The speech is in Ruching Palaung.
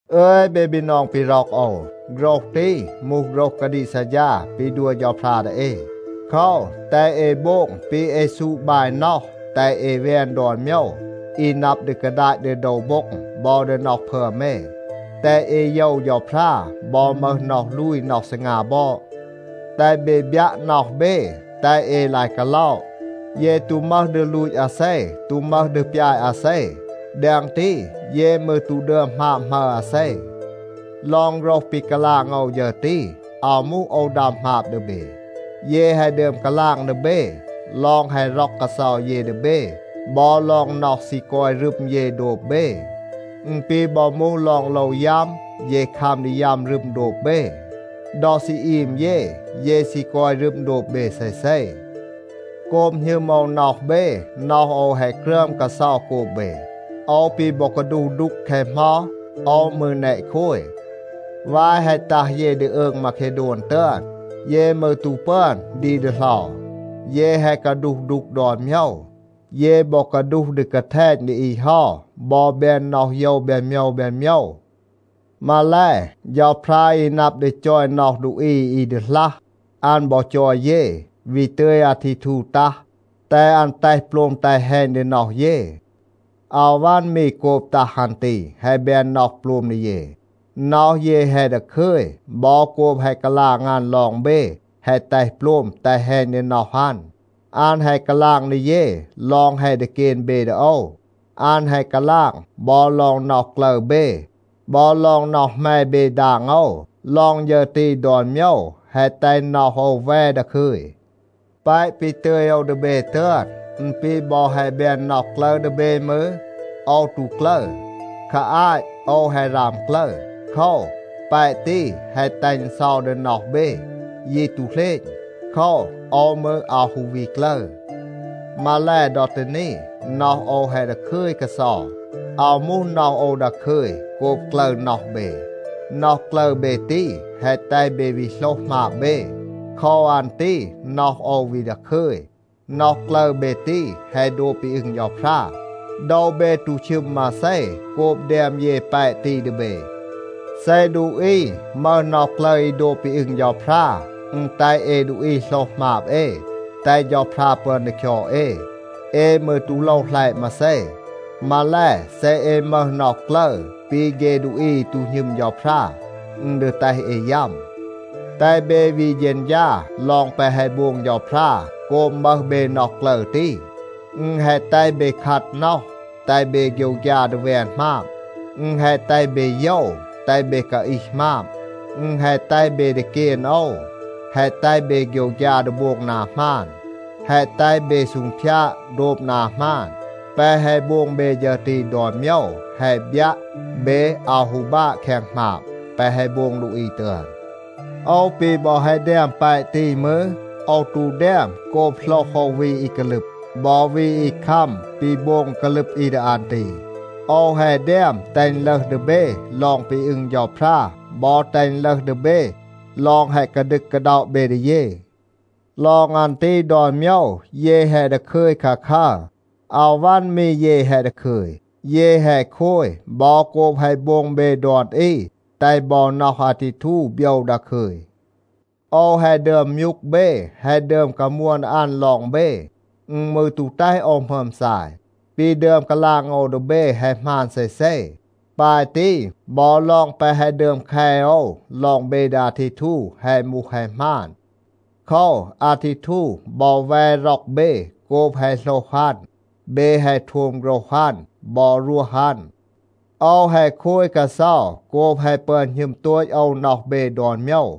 อึย เบ บีนอง ปี ร็อก โอว, โฆรห ตี มูห โฆรห กาดีก ซัดฌา ปี ดัว เฌาพรา ดี เอ. โคว, แตห เอ โบง ปี เอ ซูด บาย น็อห, แตห เอ แวน ดอน โมยว อี นับ ดี กาดาต ดี โดว โบ็ง บอ ดี น็อห พึอม เอ. แตห เอ โยว เฌาพรา บอ มึห น็อห ลูย, น็อห ซีงา บอด. แตห เบ บยัะ น็อห เบ, แตห เอ ลาย กาล็อะ. เย ตู มึห ดี ลูต อาเซ, ตู มึห ดี ปยาต อาเซ. แดง ตี, เย มืร ตู ดึอม หมาบ หมัร อาเซ. ลอง โฆรห ปี กาลาง โอว ฌึร ตี, อาว มูห โอว ดัม หมาบ ดี เบ. เย แฮะ ดึอม กาลาง ดี เบ, ลอง แฮะ ร็อก กาเซา เย ดี เบ บอ ลอง น็อห ซี กอย รึม เย โดบ เบ. อึณ ปี บอ มูห ลอง โลว ยัม, เย คัม ดี ยัม รึม โดบ เบ. ดอ ซี อีม เย, เย ซี กอย รึม โดบ เบ เซเซ. โกบ หณึม โอว น็อห เบ, น็อห โอว แฮะ กรึอม กาเซา โกบ เบ. โอว ปี บอ กาดูห ดูก แคะ เหมา, โอว มืร แนะ โคย. วาย แฮะ ตัห เย ดี อืง มาเคโดน ตึอน, เย มืร ตู ปึอน ดี ดีเหลา. เย แฮะ กาดูห ดูก ดอน โมยว. เย บอ กาดูห ดี กาแทณ ดี อี เฮา บอ แบน น็อห โยว แบน โมยว แบน โมยว. มาแล, เฌาพรา อี นับ ดี จอย น็อห ดูอี อี ดีหลัห, อัน บอ จอย เย, วี ตึย อาทีทู ตัห, แตห อัน แตห โปลม แตห แฮณ ดี น็อห เย. อาว วัน มี โกบ ตัห อัน ตี แฮะ แบน น็อห โปลม ดี เย. น็อห เย แฮะ ดาคึย บอ โกบ แฮะ กาลาง อัน ลอง เบ แฮะ แตห โปลม, แตห แฮณ ดี น็อห อัน. อัน แฮะ กาลาง ดี เย ลอง แฮะ ดีเกน เบ ดี โอว. อัน แฮะ กาลาง บอ ลอง น็อห กลึร เบ, บอ ลอง น็อห แหม เบ ดาง โอว. ลอง ฌึร ตี ดอน โมยว แฮะ แตห น็อห โอว แว ดาคึย. แปะ ปี ตึย โอว ดี เบ ตึอน, อึณ ปี บอ แฮะ แบน น็อห กลึร ดี เบ มืร, โอว ตู กลึร. คา อาต โอว แฮะ ราม กลึร. โคว, แปะ ตี แฮะ แตห อึณ เซา ดี น็อห เบ, ยี ตู เหลณ. โคว, โอว มืร อาว ฮู วี กลึร. มาแล, ดอ ตี นี, น็อห โอว แฮะ ดาคึย กาเซา. อาว มูห น็อห โอว ดาคึย โกบ กลึร น็อห เบ. น็อห กลึร เบ ตี แฮะ แตห เบ วี โหลห หมาบ เบ. โคว อัน ตี น็อห โอว วี ดาคึย. น็อห กลึร เบ ตี, แฮะ โดบ ปี อึง เฌาพรา. โดว เบ ตู ชึม มาเซ โกบ แดม เย แปะ ตี ดี เบ. เซ ดูอี มึห น็อห กลึร อี โดบ ปี อึง เฌาพรา, อึณ แตห เอ ดูอี โหลห หมาบ เอ, แตห เฌาพรา ปึอน ดี คยอด เอ. เอ มืร ตู โลว หลัยะ มาเซ. มาแล, เซ เอ มึห น็อห กลึร ปี เฆ ดูอี อี ตู หณึม เฌาพรา, อึณ ดี แตห เอ ยัม. แตห เบ วี เฌณฌา ลอง แปะ แฮะ โบง เฌาพรา โกบ มึห เบ น็อห กลึร ตี. อึณ แฮะ แตห เบ คัด น็อห, แตห เบ โฆยวฆยา ดี แวน หมาบ. อึณ แฮะ แตห เบ โยว, แตห เบ กาอีห หมาบ. อึณ แฮะ แตห เบ ดีเกน โอว, แฮะ แตห เบ โฆยวฆยา ดี โบง นา หมาน, แฮะ แตห เบ ซูงพยาด โดบ นา หมาน. แปะ แฮะ โบง เบ ฌึร ตี ดอน โมยว, แฮะ บยัะ, เบ อาว ฮู บาะ แคง หมาบ แปะ แฮะ โบง ดูอี ตึอน. โอว ปี บอ แฮะ แดม แปะ ตี มืร, โอว ตู แดม โกบ โหลห โอว วี อี กาลึบ, บอ วี อี คัม ปี โบง กาลึบ อี ดี อัน ตี. โอว แฮะ แดม แตห อึณ ลึห ดี เบ ลอง ปี อึง เฌาพรา บอ แตห อึณ ลึห ดี เบ ลอง แฮะ กาดึก กาด็อะ เบ ดี เย. ลอง อัน ตี ดอน โมยว, เย แฮะ ดาคึย คาคัร. อาว วัน มี เย แฮะ ดาคึย. เย แฮะ โคย บอ โกบ แฮะ โบง เบ ดอน อี แตห บอ น็อห อาทีทู โบยว ดาคึย. โอว แฮะ ดึอม มยูก เบ, แฮะ ดึอม กามวน ดี อัน ลอง เบ. อึณ มืร ตู แตห โอว หมึอม ซาย. ปี ดึอม กาลาง โอว ดี เบ แฮะ หมาน เซเซ. ปาย ตี บอ ลอง แปะ แฮะ ดึอม แค โอว ลอง เบ ดี อาทีทู แฮะ มูห แฮะ หมาน. โคว, อาทีทู บอ แว ร็อก เบ โกบ แฮะ โหลห อัน, เบ แฮะ โทม โฆรห อัน บอ รวห อัน. โอว แฮะ โคย กาเซา โกบ แฮะ ปึอน หณึม โตต โอว น็อห เบ ดอน โมยว.